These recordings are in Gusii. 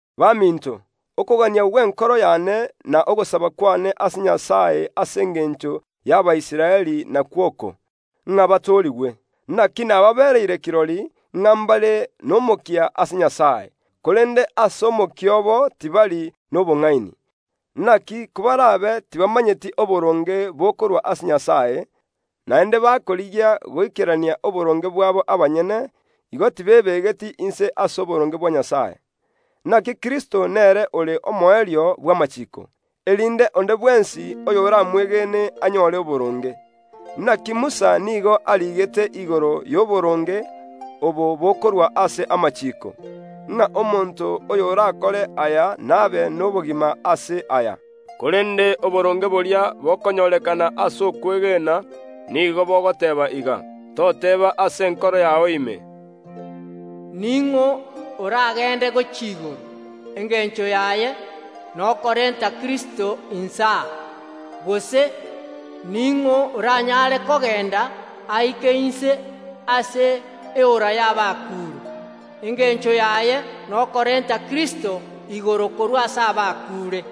Baminto okogania gw’enkoro y’ane na ogosaba kw’ane ase Nyasae ase engencho y’Abaisraeli nakwo oko, ng’a batoorigwe. Inaki nababereire kirori, ng’a ’mbare n’omokia ase Nyasae, korende ase omokia obo tibari nobong’ani. Inaki kobar’abe tibamanyeti oboronge bokorwa ase Nyasae, naende bakorigia goikerania oboronge bwabo abanyene, igo tibebegeti inse ase oboronge bwa Nyasae. Inaki Kristo nere ore omoerio bw’amachiiko, erinde onde bwensi oyoramwegene anyore oboronge. Inaki Musa nigo ariigete igoro y’oboronge obo bokorua ase amachiiko, ng’a omonto oy’orakore aya nabe n’obogima ase aya. Korende oboronge boria bokonyorekana ase okwegena nigo bogoteeba iga: Toteeba ase enkoro yao ime, “Ning’o oragende gochia igoro” (engencho yaye nokorenta Kristo inse aa); gose, “Ning’o oranyare kogenda aike inse ase eora y’abakuure?” (Engencho yaye nokorenta Kristo igoro korwa ase abakuure).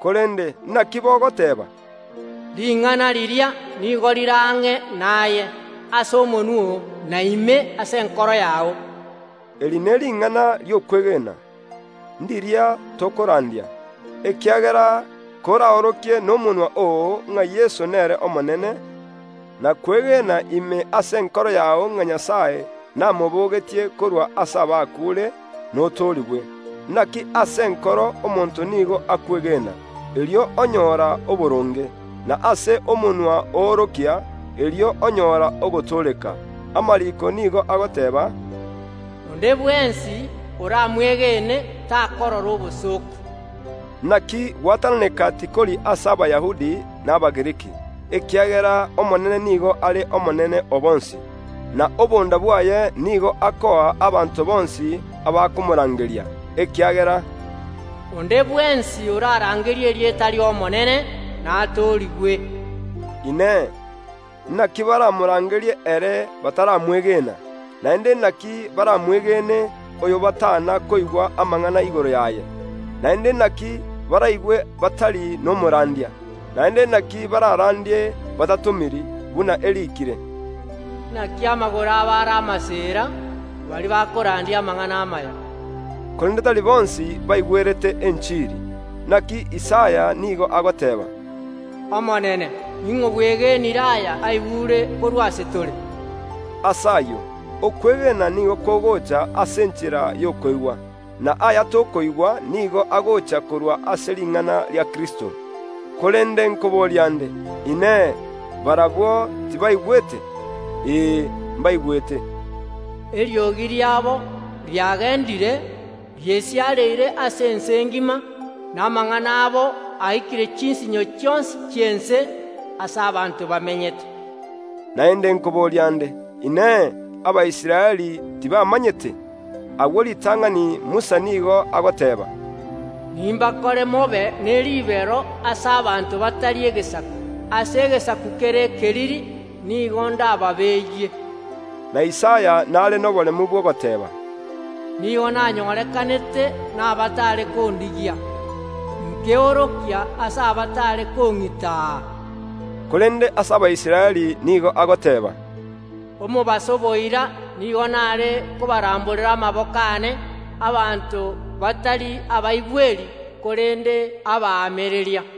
Korende, inaki bogoteeba? Ring’ana riria nigo rire ang’e naye, ase omonwa oo, na ime ase enkoro yao (eri n’ering’ana ri’okwegena, riria tokorandia). Ekiagera koraorokie nomonwa oo, ng’a Yeso nere Omonene, na kwegena ime ase enkoro yao ng’a Nyasae namobogetie korwa ase abakuure, notoorigwe. Inaki ase enkoro omonto nigo akwegena, erio onyora oboronge; na ase omonwa oorokia, erio onyora ogotooreka. Amariiko nigo agoteeba, “Onde bwensi oramwegene takorora obosooku.” Inaki gwatananeka tikori ase Abayahudi na Abagiriki, ekiagera ase Abayahudi na Abagiriki, ekiagera Omonene nigo are Omonene o bonsi, na obonda bwaye nigo akoa abanto bonsi abakomorangeria. Ekiagera, “Onde bwensi orarangerie erieta ri’Omonene natoorigwe.” Inee! Inaki baramorangerie ere bataramwegena? Naende inaki baramwegene oyo batana koigwa amang’ana igoro yaye? Naende inaki baraigwe batari nomorandia? Naende inaki bararandie batatomiri? Buna eriikire, “Inaki amagoro abo are amaseera, baria bakorandia amang’ana amaya!” Korende tari bonsi baigwerete enchiri. Inaki Isaya nigo agoteeba, “Omonene, ning’o bwegenire aya aigure korwa ase tore?” Ase ayio, okwegena nigo kogoocha ase enchera y’okoigwa, na aya tokoigwa nigo agoocha korwa ase ring’ana ria Kristo. Korende nkoboria ’nde: Inee! Barabwo tibaigwete? Ee, mbaigwete, “Egeturi kieriogi riabo giesiareire ase ense engima, na amang’ana abo aikire chinsinyo chionsi chi’ense aase abanto bamenyete.” Naende nkoboria ’nde: Inee! Abaisraeli tibamanyete? Agwo ritang’ani Musa nigo agoteeba, “Nimbakore mobe ne ribero ase abanto batari egesaku, ase egesaku kere ekeriri nigo ndababeeyie.” Na Isaya n’are noboremu bw’ogoteeba, “Nigo nanyorekanete n’abaatare kondigia; nkeorokia ase abataare kong’itaa.” Korende ase Abaisraeli nigo agoteeba, “Omobaso boira nigo n’are kobaramborera amaboko aane abanto batari abaigweri korende abaamereria.”